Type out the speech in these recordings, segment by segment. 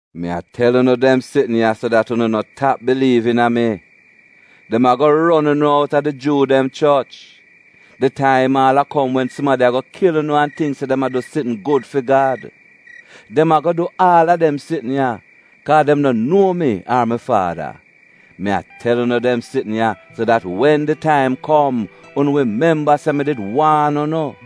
“Mi a tel unu dem sitn ya so dat unu no tap biliiv iina mi. Dem ago ron unu outa di Juu dem Choch. Di taim aal a kom wen sumadi ago kil unu an tingk se dem a du sitn gud fi Gad. Dem ago du aal a dem sitn ya, kaa dem no nuo mi ar mi Faada. Mi a tel unu dem sitn ya, so dat wen di taim kom, unu wi memba se mi did waan unu.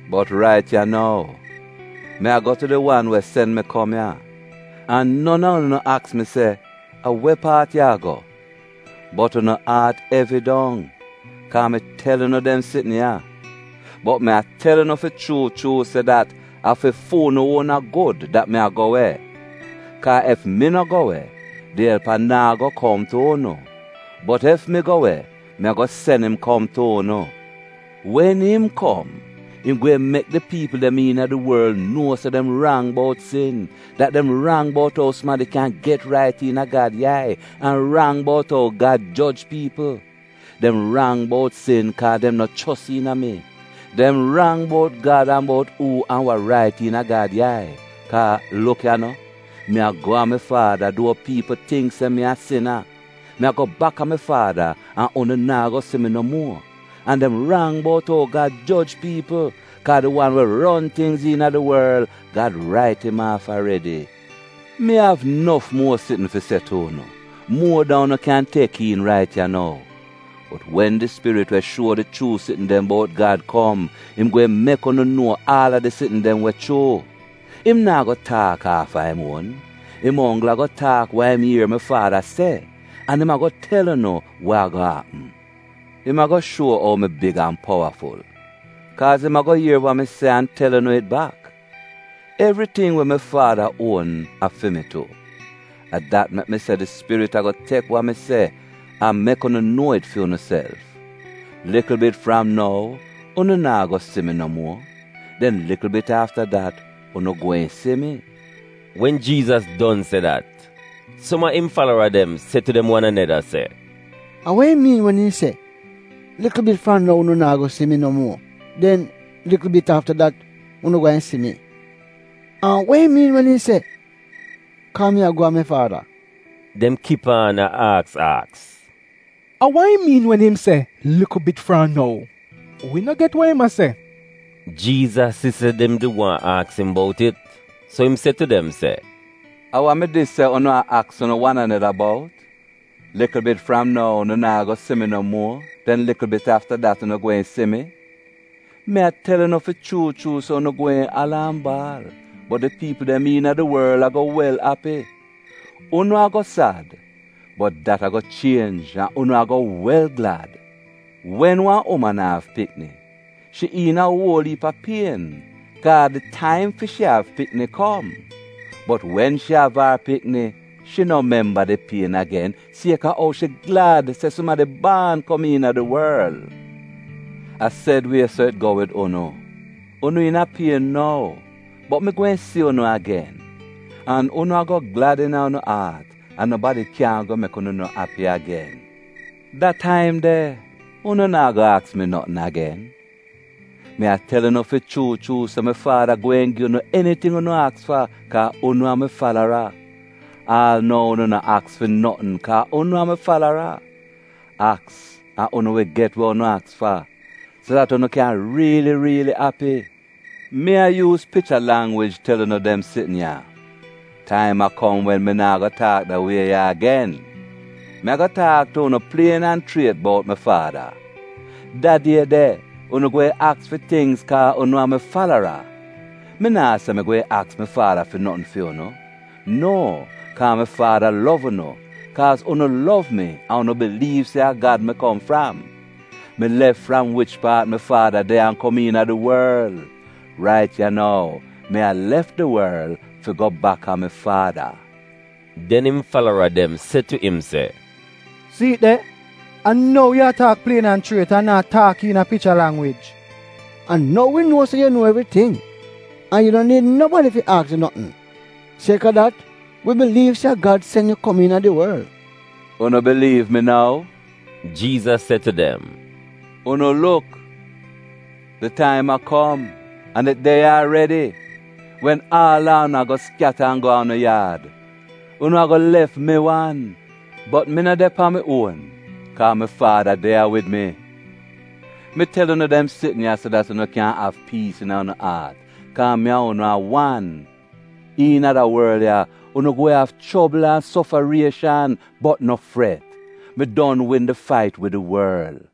Bot rait ya nou, mi a go tu di wan we sen mi kom ya, an non a unu no aks mi se, ‘A we paat yu a go?’ Bot unu aat evi dong, kaa mi tel unu dem sitn ya. Bot mi a tel unu fi chuu chuu se dat a fi fu'unu uona gud dat mi a go we. Kaa ef mi no go we, di Elpa naa go kom tu unu. Bot ef mi go we mi ago sen im kom tu unu. Wen im kom, im gweehn mek di piipl dem iina di worl nuo se dem rang bout sin, dat dem rang bout ou sumadi kyan get rait iina Gad yai an rang bout ou Gad joj piipl. Dem rang bout sin, kaa dem no chos iina mi. Dem rang bout Gad an bout uu an wa rait iina Gad yai, kaa, luk ya no, mi a go a mi Faada duo piipl tingk se mi a sina. Mi a go bak a mi Faada an unu naa go si mi no muo. An dem rang bout ou Gad joj piipl, kaa di wan we ron tingz iina di worl, Gad rait im aaf aredi. “Mi av nof muo sitn fi se tu unu, muo dan unu kyan tek iin rait ya nou. Bot wen di Spirit we shuo di chuu sitn dem bout Gad kom, im gweehn mek unu nuo aal a di sitn dem we chuu. Im naa go taak aafa im uon. Im onggl ago taak wa im ier mi Faada se, an im ago tel unu wa ago apm. Im ago shuo ou mi big an powaful, kaaz im ago ier wa mi se an tel unu it bak. Evriting we mi Faada uon, a fi mi tu. A dat mek mi se di Spirit ago tek wa mi se an mek unu nuo it fi unuself. “Likl bit fram nou unu naa go si mi no muo, den likl bit afta dat unu gweehn si mi.” Wen Jiizas don se dat, som a im falara dem se tu dem wan aneda se, “A wa im miin wen im se, ‘Likl bit fram nou unu naa go si mi no muo, den likl bit afta dat unu gweehn si mi’? An wa im miin wen im se, ‘Kaa mi a go a mi Faada’?” Dem kip aan a aks aks, “A wa im miin wen im se, ‘Likl bit fram nou’? Wi no get we im a se.” Jiizas si se dem did waahn aks im bout it, so im se tu dem se, “A wa mi dis se unu a aks unu wan aneda bout, ‘Likl bit fram nou unu naa go si mi no muo, den likl bit afta dat unu gweehn si mi’? Mi a tel unu fi chuu chuu se unu gweehn ala an baal, bot di piipl dem iina di worl ago wel api. Unu ago sad, bot dat a o chienj an unu ago wel glad. Wen wan uman a av pikni shi iina uol iip a pien, kaa di taim fi shi av pikni kom. Bot wen shi av ar pikni, shi no memba di pien agen sieka ou shi glad se sumadi baan kom iina di worl. A sed wie so it go wid unu: Unu iina pien nou, bot mi gweehn si unu agen, an unu a glad iina unu aat, an nobadi kyan go mek unu no api agen. Da taim de, unu naa go aks mi notn agen. Mi a tel unu fi chuu chuu se mi Faada gweehn gi unu eniting unu aks fa kaa unu a mi falara. Aal nou unu no aks fi notn kaa unu a mi falara. Aks an unu wi get we unu aks fa, so dat unu kyan riili riili api. “Mi a yuuz picha langwij tel unu dem sitn ya. Taim a kom wen mi naa go taak da wie ya agen. Mi ago taak tu unu plien an chriet bout mi Faada. Da die de, unu gweehn aks fi tingz kaa unu a mi falara. Mi naa se mi gweehn aks mi Faada fi notn fi unu. No, kaa mi Faada lov unu, kaaz unu lov mi an unu biliiv se a Gad mi kom fram. Mi lef fram wich paat mi Faada de an kom iina di worl. Rait ya nou, mi a lef di worl fi go baka mi Faada.” Den im falara dem se tu im se, “Si'it de, a nou yu a taak plien an chriet an naa taak iina picha langwij! A nou wi nuo se yu nuo evriting, an yu no niid nobadi fi aks yu notn. Sieka dat, wi biliiv se a Gad sen yu kom iina di worl.” “Unu biliiv nou?” Jiizas se tu dem. “Unu luk! Di taim a kom — an it de ya aredi — wen aal a unu ago skyata an go a unu yaad. Unu ago lef mi wan. Bot mi no de pan mi uon, kaa mi Faada de ya wid mi. “Mi tel unu dem sitn ya so dat unu kyan av piis iina unu aat kaa mi an unu a wan. Iina da worl ya, unu gweehn av chobl an sofarieshan. Bot no fret! Mi don win di fait wid di worl.”